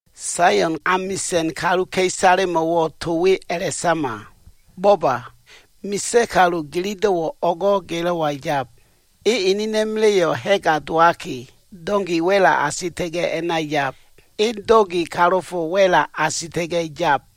“Saion amisa꞉n kaluka꞉isalemo꞉wo꞉ to we a꞉la꞉sama. ‘Bo꞉ba, misa꞉ kalu ginido꞉wo꞉ o꞉go꞉ gilo꞉wa yab. E enena꞉ma꞉la꞉yo꞉ ha꞉ga dowaki, donki wa꞉la asita꞉ga꞉ a꞉na yab. E donki kalofo wa꞉la asita꞉ga꞉ yab.’”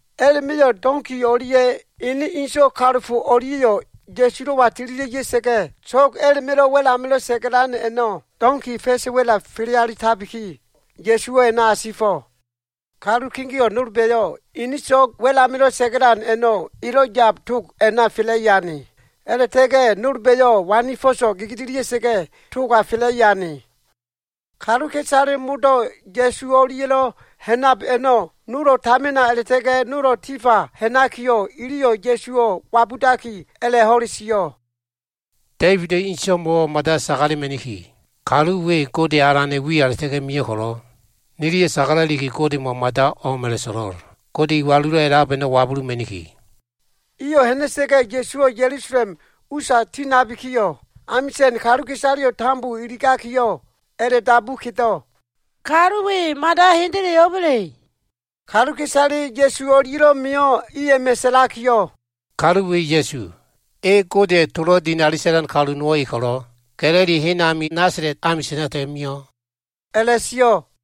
A꞉la꞉ma꞉yo꞉ donki o꞉lia꞉ ene inso꞉ kalofo o꞉lia꞉yo꞉ Ya꞉sulo꞉wa tililia꞉ ya꞉sa꞉ga꞉, so꞉g a꞉la꞉ma꞉lo꞉ wa꞉l amilo꞉ sa꞉ga꞉lan a꞉no꞉ donki a꞉la꞉ma꞉ fa꞉sa꞉ wa꞉la fele alitabiki, Ya꞉suwo꞉ a꞉na asifo꞉. Kalu kegeo꞉ nolba꞉yo꞉ ini so꞉g wa꞉l amilo꞉ sa꞉ga꞉lan a꞉no꞉ elo꞉ yab tog a꞉na fela꞉i ane. A꞉la꞉ta꞉ga꞉ nolba꞉yo꞉ wani fo꞉so꞉ gegedelia꞉sa꞉ga꞉ toga fela꞉i ane. Kaluka꞉isale modo꞉ Ya꞉su o꞉lia꞉lo꞉ ha꞉nab a꞉no꞉, nolo꞉ tamina a꞉la꞉ta꞉ga꞉, nolo꞉ tifa ha꞉nakiyo꞉, iliyo꞉ Ya꞉suwo꞉ wabudaki, a꞉la꞉ ho꞉le sio꞉, “Da꞉ibida꞉ inso꞉mo꞉wo꞉ mada sagalema꞉niki. Kalu we, Gode Alana꞉ wiya a꞉la꞉ta꞉ga꞉ mio꞉ ko꞉lo꞉, niliyo꞉ sagala꞉liki, Godemo꞉ mada o꞉m a꞉la꞉so꞉lo꞉l. Gode Iwalulo꞉ A꞉lab a꞉no꞉ wabuluma꞉niki.” Iyo꞉ ha꞉na꞉sa꞉ga꞉, Ya꞉suwo꞉ Ya꞉lusalem usa tinabikiyo꞉, amisa꞉n kaluka꞉isaleyo꞉ tambo iligakiyo꞉, a꞉la꞉dabu kedo꞉, “Kalu we hendele mada o꞉ba꞉le?” Kaluka꞉isale Ya꞉su o꞉lia꞉lo꞉ mio꞉ i a꞉ma꞉ sa꞉lakiyo꞉, “Kalu we Ya꞉su. E Godeya꞉ tolo꞉ dinali sa꞉lan kalu nowo꞉ e ko꞉lo꞉, Ga꞉lili hen ami Nasala꞉t amisa꞉na a꞉la꞉ta꞉ga꞉ mio꞉,” a꞉la꞉sio꞉.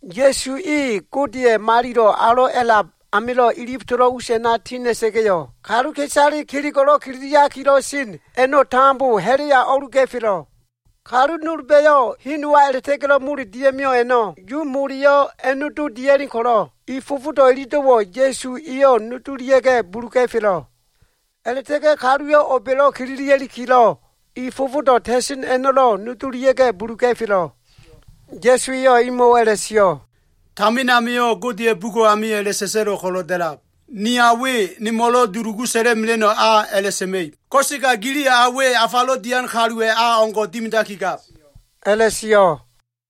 Ya꞉su e Godeya꞉ Malilo꞉ Alo꞉ a꞉lab amilo꞉ ilif tolo꞉ us a꞉na ti ha꞉na꞉ga꞉yo꞉, kaluka꞉isale kelego꞉lo꞉ kililia꞉likilo꞉ sen a꞉no꞉ tambo ha꞉la꞉ya o꞉luga꞉felo꞉. Kalu nolba꞉yo꞉ hen nowa a꞉la꞉ta꞉ga꞉lo꞉ mole dia꞉mio꞉ a꞉no꞉ Yu mole a꞉nodo dia꞉len ko꞉lo꞉, i fofodo꞉ ilido꞉wo꞉ Ya꞉su eyo꞉ nodolia꞉ga꞉ buluga꞉felo꞉. A꞉la꞉ta꞉ga꞉ kaluwa꞉ o꞉ba꞉lo꞉ kililia꞉likilo꞉ i fofodo꞉ ta꞉sen a꞉no꞉lo꞉ nodolia꞉ga꞉ buluga꞉felo꞉. Ya꞉su eyo꞉ imo꞉wo꞉ a꞉la꞉sio꞉, “Tamin amio꞉ Godeya꞉ bugo꞉ amio꞉ a꞉la꞉sa꞉sa꞉lo꞉ ko꞉lo꞉ da꞉lab, ‘Ni a we nemo꞉lo꞉ dulugu sa꞉la꞉mela꞉no꞉ a a꞉la꞉sa꞉ma꞉ib.’ Ko꞉sega giliyo꞉ a we afalo꞉ dian kaluwa꞉ a o꞉ngo꞉ dimidakigab,” a꞉la꞉sio꞉.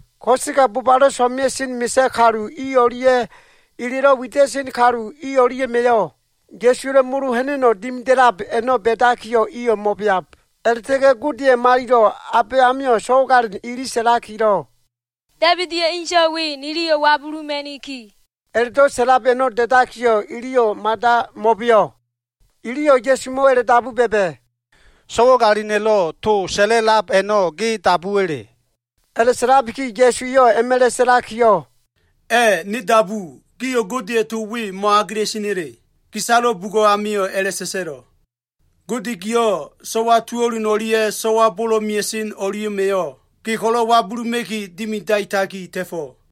Ko꞉sega bobalo꞉ so꞉mea꞉sen misa꞉ kalu i o꞉lia꞉, elelo꞉ wida꞉sen kalu i o꞉lia꞉ma꞉yo꞉, Ya꞉suwa꞉lo꞉ mo꞉lo꞉ ha꞉na꞉no꞉ dimida꞉lab a꞉no꞉ ba꞉dakiyo꞉ mo꞉beab. A꞉la꞉ta꞉ga꞉ Godeya꞉ Malilo꞉ Abayamio꞉ so꞉wagalin ili sa꞉lakilo꞉, “Da꞉ibida꞉ inso꞉ we niliyo꞉ wabuluma꞉niki!” a꞉la꞉do꞉ sa꞉lab a꞉no꞉ da꞉dakiyo꞉, iliyo꞉ mada mo꞉beo꞉. Iliyo꞉ Ya꞉sumo꞉wo꞉ a꞉la꞉dabu ba꞉ba꞉, “So꞉wagalina꞉lo꞉ to sa꞉la꞉lab a꞉no꞉ ge dabuwa꞉le?” A꞉la꞉sa꞉labiki Ya꞉su eyo꞉ a꞉ma꞉la꞉ sa꞉lakiyo꞉, “A꞉ ne dabu. Gio꞉ Godeya꞉ to we mo꞉agela꞉sena꞉le? Gisalo bugo꞉ amio꞉ a꞉la꞉sa꞉sa꞉lo꞉, “ ‘Gode giyo꞉, so꞉wa tuo꞉lun o꞉lia꞉ so꞉wa bolo꞉ mea꞉sen o꞉lia꞉ma꞉yo꞉ Ge ko꞉lo꞉ wabuluma꞉ki dimidaitaki ta꞉fo꞉.’”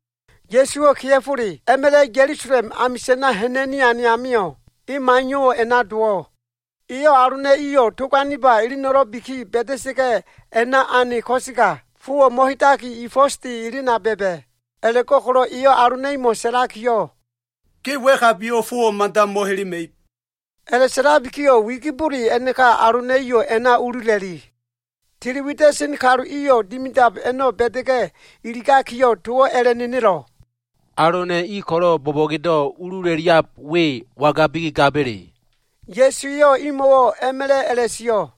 Ya꞉suwo꞉ kea꞉fole a꞉ma꞉la꞉ Ya꞉lusalem amisa꞉na ha꞉na꞉ni ane amio꞉, e maiyo꞉wo꞉ a꞉na dowo꞉. Eyo꞉ alona꞉ iyo꞉ tog aniba eleno꞉lo꞉biki ba꞉da꞉sa꞉ga꞉, a꞉na ane ko꞉sega, fowo꞉ mo꞉hedaki, i fo꞉sde elena ba꞉ba꞉. A꞉la꞉go꞉ko꞉lo꞉ eyo꞉ alona꞉ imo꞉ sa꞉lakiyo꞉, “Ge wa꞉kabiyo꞉ fowo꞉ mada mo꞉helema꞉ib.” A꞉la꞉sa꞉labikiyo꞉ wigibole a꞉naka alona꞉ iyo꞉ a꞉na ulula꞉li. Tili wida꞉sen kalu iyo꞉ dimidab a꞉no꞉ ba꞉da꞉ga꞉ iligakiyo꞉ towo꞉ a꞉la꞉nenelo꞉, “Alona꞉ i ko꞉lo꞉ bo꞉bo꞉gedo꞉ ulula꞉liab we wangabiki gaba꞉le?” Ya꞉su eyo꞉ imo꞉wo꞉ a꞉ma꞉la꞉ a꞉la꞉sio꞉,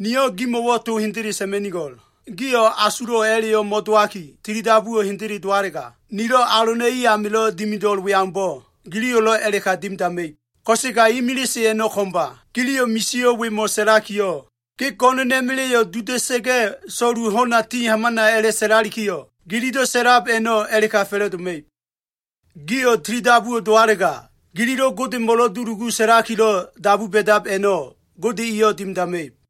“Niyo꞉ gimo꞉wo꞉ to hendele sa꞉ma꞉nigo꞉l. Gio꞉ asulo꞉ a꞉la꞉yo꞉ mo꞉dowaki, tilidabuwo꞉ hendele dowalega, nilo꞉ alona꞉ i amilo꞉ dimido꞉l we aumbo꞉, giliyo꞉lo꞉ a꞉la꞉ka dimidama꞉ib. Ko꞉sega imilise a꞉no꞉ ko꞉mba. Giliyo꞉ misio꞉ wemo꞉ sa꞉lakiyo꞉, ‘Ge go꞉no꞉na꞉ma꞉la꞉yo꞉ duda꞉sa꞉ga꞉, so꞉lu ho꞉na ti hamana’ a꞉la꞉sa꞉lalikiyo꞉, gililo꞉ sa꞉lab a꞉no꞉ a꞉la꞉ka fa꞉la꞉doma꞉ib. Gio꞉ tilidabuwo꞉ dowalega, gililo꞉ Godemo꞉lo꞉ dulugu sa꞉lakilo꞉ dabu ba꞉dab a꞉no꞉, Gode eyo꞉ dimidama꞉ib.”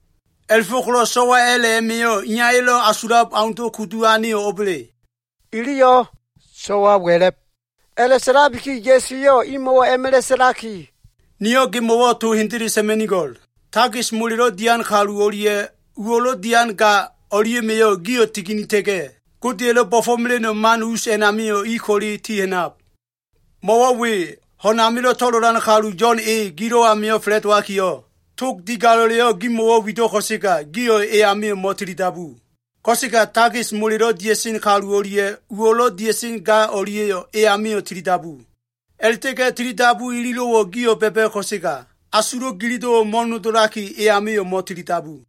A꞉la꞉fo꞉ko꞉lo꞉ so꞉wa a꞉la꞉ a꞉ma꞉yo꞉ iyaya꞉lo꞉ asulab aundo꞉ kudu aneyo꞉ o꞉ba꞉le?” Iliyo꞉, “So꞉wa wa꞉la꞉b.” A꞉la꞉sa꞉labiki Ya꞉su eyo꞉ imo꞉wo꞉ a꞉ma꞉la꞉ sa꞉laki, “Niyo꞉ gimo꞉wo꞉ to hendele sa꞉ma꞉nigo꞉l. Takis molelo꞉ dian kalu o꞉lia꞉ uwo꞉lo꞉ dian ga o꞉lia꞉ma꞉yo꞉ gio꞉ tiginita꞉ga꞉, Godeya꞉lo꞉ bo꞉fo꞉mela꞉no꞉ man us a꞉namio꞉ i ko꞉le tiha꞉nab. Mo꞉wo꞉ we, ho꞉n amilo꞉ to꞉lolan kalu Yo꞉n e, gilo꞉ amio꞉ fa꞉la꞉dowakiyo꞉, tog digalo꞉leyo꞉ gimo꞉wo꞉ wido꞉ ko꞉sega, gio꞉ e amio꞉ mo꞉tilidabu. Ko꞉sega takis molelo꞉ dia꞉sen kalu o꞉lia꞉ uwo꞉lo꞉ dia꞉sen ga o꞉lia꞉yo꞉ e amio꞉ tilidabu. A꞉la꞉ta꞉ga꞉ tilidabu ilido꞉wo꞉ gio꞉ ba꞉ba꞉ ko꞉sega, asulo꞉ gililo꞉wo꞉ mo꞉nodolaki, e amio꞉ mo꞉tilidabu.”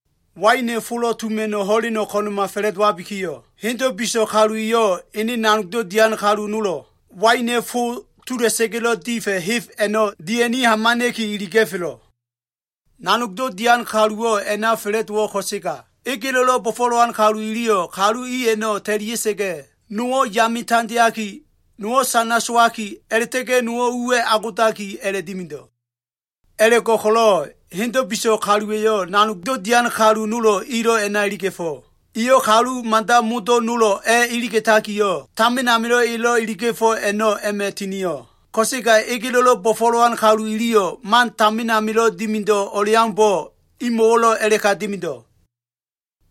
Waina꞉ folo꞉ tuma꞉no꞉ ho꞉leno꞉ ko꞉na꞉ma fa꞉la꞉dowabikiyo꞉, hendo꞉ biso꞉ kalu eyo꞉ ene nanogdo꞉ dian kalu nolo꞉ waina꞉ fo tola꞉sa꞉ga꞉lo꞉ difa꞉, heb a꞉no꞉ dia꞉ni hamana꞉ki iliga꞉felo꞉. Nanogdo꞉ dian kaluwo꞉ a꞉na fa꞉la꞉dowo꞉ ko꞉sega, egelo꞉lo꞉ bo꞉fo꞉len kalu iliyo꞉ kalu i a꞉no꞉ ta꞉lia꞉sa꞉ga꞉, nowo꞉ yame tandeaki, nowo꞉ sana sowaki a꞉la꞉ta꞉ga꞉ nowo꞉ uwa꞉ agodaki a꞉la꞉dimido꞉. A꞉la꞉go꞉ko꞉lo꞉ hendo꞉ biso꞉ kaluwa꞉yo꞉ nanogdo꞉ dian kalu nolo꞉ ilo꞉ a꞉na iliga꞉fo꞉. Eyo꞉ kalu mada modo꞉ nolo꞉ a꞉ iliga꞉takiyo꞉, tamin amilo꞉ elo꞉ iliga꞉fo꞉ a꞉no꞉ a꞉ma꞉ tinio꞉. Ko꞉sega egelo꞉lo꞉ bo꞉fo꞉len kalu iliyo꞉ man tamin amilo꞉ dimido꞉ o꞉leaumbo꞉ imo꞉wo꞉lo꞉ a꞉la꞉ka dimido꞉.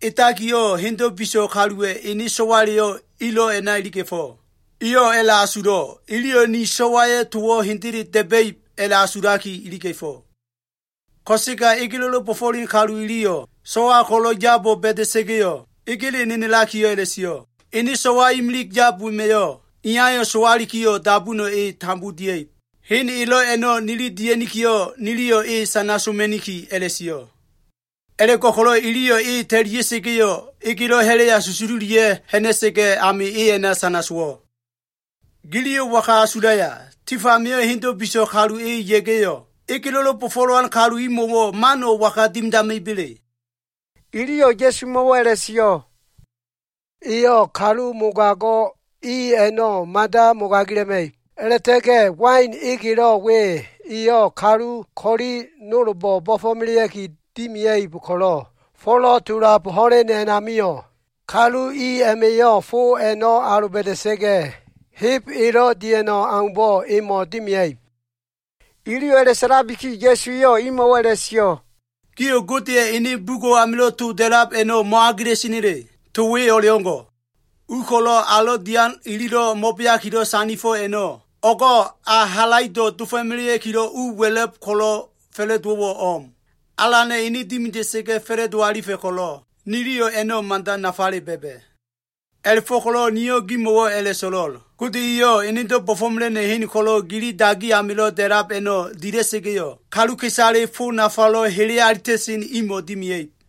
Edakiyo꞉ hendo꞉ biso꞉ kaluwa꞉ ene so꞉waleyo꞉ ilo꞉ a꞉na iliga꞉fo꞉. Eyo꞉ a꞉la꞉asulo꞉, ‘Iliyo꞉ ni so꞉waya꞉ towo꞉ hendele da꞉ba꞉ib,’ a꞉la꞉asulaki iliga꞉fo꞉. Ko꞉sega egelo꞉lo꞉ bo꞉fo꞉len kalu iliyo꞉ so꞉wa ko꞉lo꞉ yabo꞉ ba꞉da꞉sa꞉ga꞉yo꞉, egele nenelakiyo꞉ a꞉la꞉sio꞉, ‘Ene so꞉wa imilig yab wema꞉yo꞉, iyayo꞉ sowalikiyo꞉ dabuno꞉ e tambo dia꞉ib. Hen elo꞉ a꞉no꞉ nili dia꞉nikiyo꞉, niliyo꞉ e sana soma꞉niki,’ a꞉la꞉sio꞉. A꞉la꞉go꞉ko꞉lo꞉ iliyo꞉ e ta꞉lia꞉sa꞉ga꞉yo꞉, egelo꞉ ha꞉la꞉ya susululia꞉ ha꞉na꞉sa꞉ga꞉ ami a꞉na sana sowo꞉. Giliyo꞉ waga asulaya? Tif amio꞉ hendo꞉ biso꞉ kalu e ya꞉ga꞉yo꞉, egelo꞉lo꞉ bo꞉fo꞉len kalu imo꞉wo꞉ mano꞉ waga dimidama꞉iba꞉le?” Iliyo꞉ Ya꞉sumo꞉wo꞉ a꞉la꞉sio꞉, “Eyo꞉ kalu mogago꞉ i a꞉no꞉ mada mogagila꞉ma꞉ib. A꞉la꞉ta꞉ga꞉ wain egelo꞉ we eyo꞉ kalu ko꞉li nolbo꞉ bo꞉fo꞉melea꞉ki dimia꞉ib ko꞉lo꞉, folo꞉ tulab ho꞉len a꞉namio꞉, kalu i a꞉ma꞉yo꞉ fo a꞉no꞉ aloba꞉da꞉sa꞉ga꞉ heb elo꞉ dia꞉no꞉ aumbo꞉ emo꞉ dimea꞉ib.” Iliyo꞉ a꞉la꞉sa꞉labiki, Ya꞉su eyo꞉ imo꞉wo꞉ a꞉la꞉sio꞉, “Gio꞉ Godeya꞉ ene bugo꞉ amilo꞉ to da꞉lab a꞉no꞉ mo꞉agela꞉sena꞉le? To we o꞉leo꞉ngo꞉, “ ‘ U ko꞉lo꞉ alo꞉ dian ililo꞉ mo꞉beakilo꞉ sandifo꞉ a꞉no꞉, o꞉go꞉ ayo꞉ halaido꞉ dofo꞉melea꞉kilo꞉ u wa꞉la꞉b ko꞉lo꞉ fa꞉la꞉dowo꞉wo꞉ o꞉m. Alana꞉ ene dimida꞉sa꞉ga꞉ fa꞉la꞉do alifa꞉ ko꞉lo꞉, niliyo꞉ a꞉no꞉ mada nafale ba꞉ba꞉.’ A꞉la꞉fo꞉ko꞉lo꞉ niyo꞉ gimo꞉wo꞉ a꞉la꞉so꞉lo꞉l. Gode eyo꞉ enedo꞉ bo꞉fo꞉mela꞉no꞉ hen ko꞉lo꞉ gili dagi amilo꞉ da꞉lab a꞉no꞉ dila꞉sa꞉ga꞉yo꞉, kaluka꞉isale fo nafalo꞉ hele alita꞉sen imo꞉ dimea꞉ib.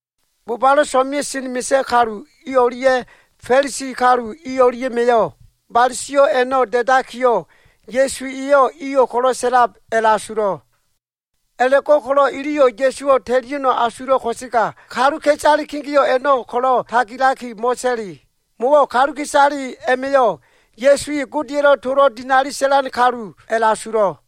Bobalo꞉ so꞉mea꞉sen misa꞉ kalu i o꞉lia꞉ Fa꞉lisi kalu i o꞉lia꞉ma꞉yo꞉, bale sio꞉ a꞉no꞉ da꞉dakiyo꞉, Ya꞉su eyo꞉ iyo꞉ ko꞉lo꞉ sa꞉lab a꞉la꞉asulo꞉. A꞉la꞉go꞉ko꞉lo꞉ iliyo꞉ Ya꞉suwo꞉ ta꞉lia꞉no꞉ asulo꞉ ko꞉sega, kaluka꞉isale kegeo꞉ a꞉no꞉ ko꞉lo꞉ tagilaki mo꞉ta꞉li. Mo꞉wo꞉ kaluka꞉isale a꞉ma꞉yo꞉ Ya꞉su e Godeya꞉lo꞉ tolo꞉ dinali sa꞉lan kalu a꞉la꞉asulo꞉.